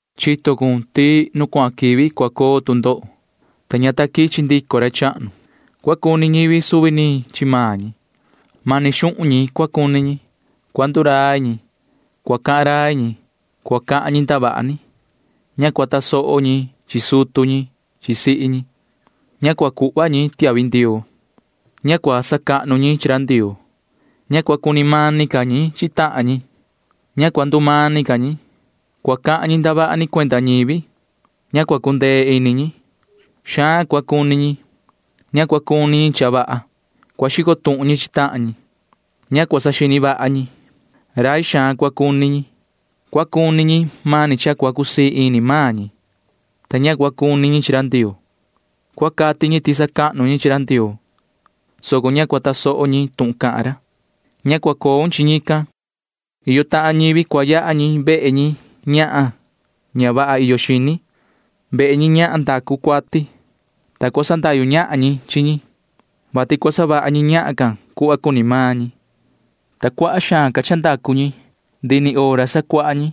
Chito cun ti nu cuahan quivi cua coo tu ndoho, [ta ña ta quichi ndico ra chahnu]. Cua cuni ñivi suvi ni chi maan ñi. Mani xuhun ñi cua cuni ñi. Cua ndurai ñi. Cua cahan rai ñi. Cua cahan ñi ndavaha ni. Ña cua tasoho ñi chi sutu ñi chi sihi ñi. Ña cua cuhva ñi tiahvi ndioo. Ña cua sacahnu ñi chi ra Ndioo. Ña cua cuni mani ñi chi tahan ñi. Ña cua ndumani ca ñi. Cua cahan ñi ndavaha ni cuenda ñivi. Ña cua cundee ini ñi. Xaan cua cuni ñi. Ña cua cuni ñi cha vaha. Cua xico tuhun ñi chi tahan ñi. Ña cua saxini vaha ñi. Rai xaan cua cuni ñi. Cua cuni ñi mani cha cua cusii ini maan ñi, ta ña cua cuni ñi chi ra Ndioo. Cua cati ñi ti sacahnu ñi chi ra Ndioo, soco ña cua tasoho ñi tuhun cahan ra. Ña cua coun chi ñican. Iyo tahan ñivi cua yaha ñi vehe ñi ñahan ña vaha iyo xini, vehe ñi ñahan ndacu cuati, ta cua sandahyu ñahan ñi chi ñi, vati cua savaha ñi ñahan can cuhva cuni maan ñi, ta cuaha xaan ca cha ndacu ñi. Ndihi ni hora sacuaha ñi,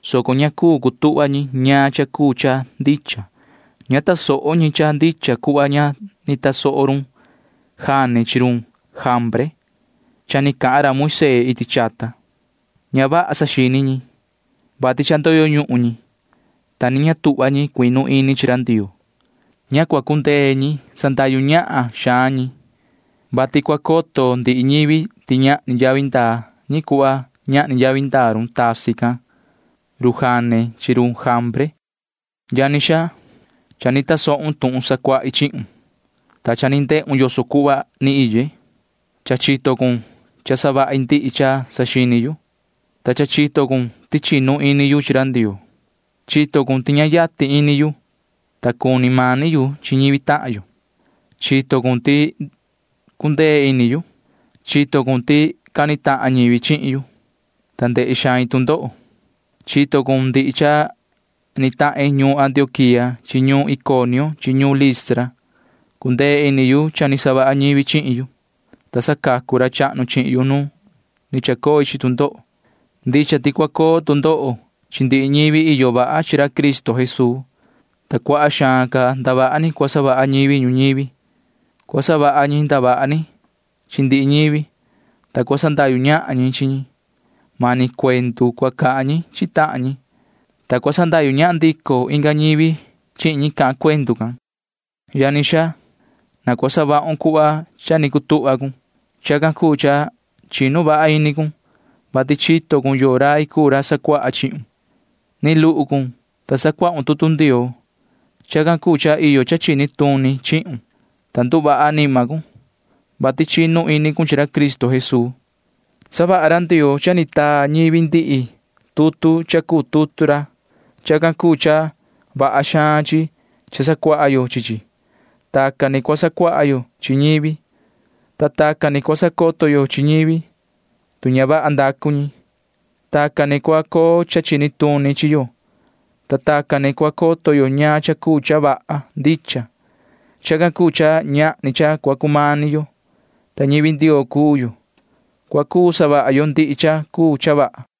soco ña cuu cutuhva ñi ñaan cha cuu cha ndicha. Ña tasoho ñi cha ndicha cuhva ña ni tasoho run Jane chi run Jambre cha ni cahan ra Moisee iti chata. Ña vaha saxini ñi, vati cha ndoyo ñuhun ñi, ta ni ña tuhva ñi cuinu ini ñi chi ra Ndioo. Ña cua cundee ñi sandahyu ñahan xaan ñi, vati cua coto ndihi ñivi ti ñahni yavi ndaa ñi cuhva ñahni yavi ndaa run tasi can run Jane chi run Jambre. Yoho yani xaa, cha ni tasohun tuhun sacuahi chihun, ta cha ni ndehun yoso cuhva ni iye. Cha chito cun cha savahi ndihi cha saxini yu, ta cha chito cun ti chinu ini yu chi ra Ndioo. Chito cun ti ña yatin ini yu, ta cuni mani yu chi ñivi tahan yo. Chito cun ti cundee ini yu. Chito cun ti cani tahan ñivi chihin yu, ta ndehe xain tu ndoho. Chito cun ndihi cha ni tahin ñuun Antioquía chi ñuun Iconio chi ñuun Listra. Cundee ini yu cha ni savaha ñivi chihin yu, ta sacacu ra chahnu chihin yu nu ni chacoi chi tu ndoho. Ndicha ti cua coo tu ndoho chi ndihi ñivi iyo vaha chi ra Cristo Jesuu, ta cuaha xaan ca ndavaha ni cua savaha ñivi ñuñivi. Cua savaha ñi ndavaha ni chi ndihi ñivi, ta cua sandahyu ñahan ñi chi ñi. Mani cuendu cua cahan ñi chi tahan ñi, ta cua sandahyu ñahan ndico inga ñivi chihin ñi cahan cuendu can. Yani xaa, na cua savahun cuhva cha ni cutuhva cun. Chacan cuu cha chinu vaha ini cun, vati chito cun yoo rai cuu ra sacuaha chihun. Ni luhu cun, ta sacuahun tutu Ndioo. Chacan cuu cha iyo cha chini tuni chihun, ta nduvaha anima cun, vati chinu ini cun chi ra Cristo Jesuu. Savaha ra Ndioo cha ni taa ñivi ndihi tutu cha cuu tutu ra. Chacan cuu cha vaha xaan chi cha sacuaha yo chi chi. Tacan ni cua sacuaha yo chi ñivi, ta tacan ni cua sacoto yo chi ñivi, tu ña vaha ndacu ñi. Tacan ni cua coo cha chini tuni chi yo, ta tacan ni cua coto yo ñaan cha cuu cha vaha ndicha. Chacan cuu cha ñahni cha cua cumani yo, ta ñivi Ndioo cuu yo. Cua cuu savaha yo ndihi cha cuu cha vaha.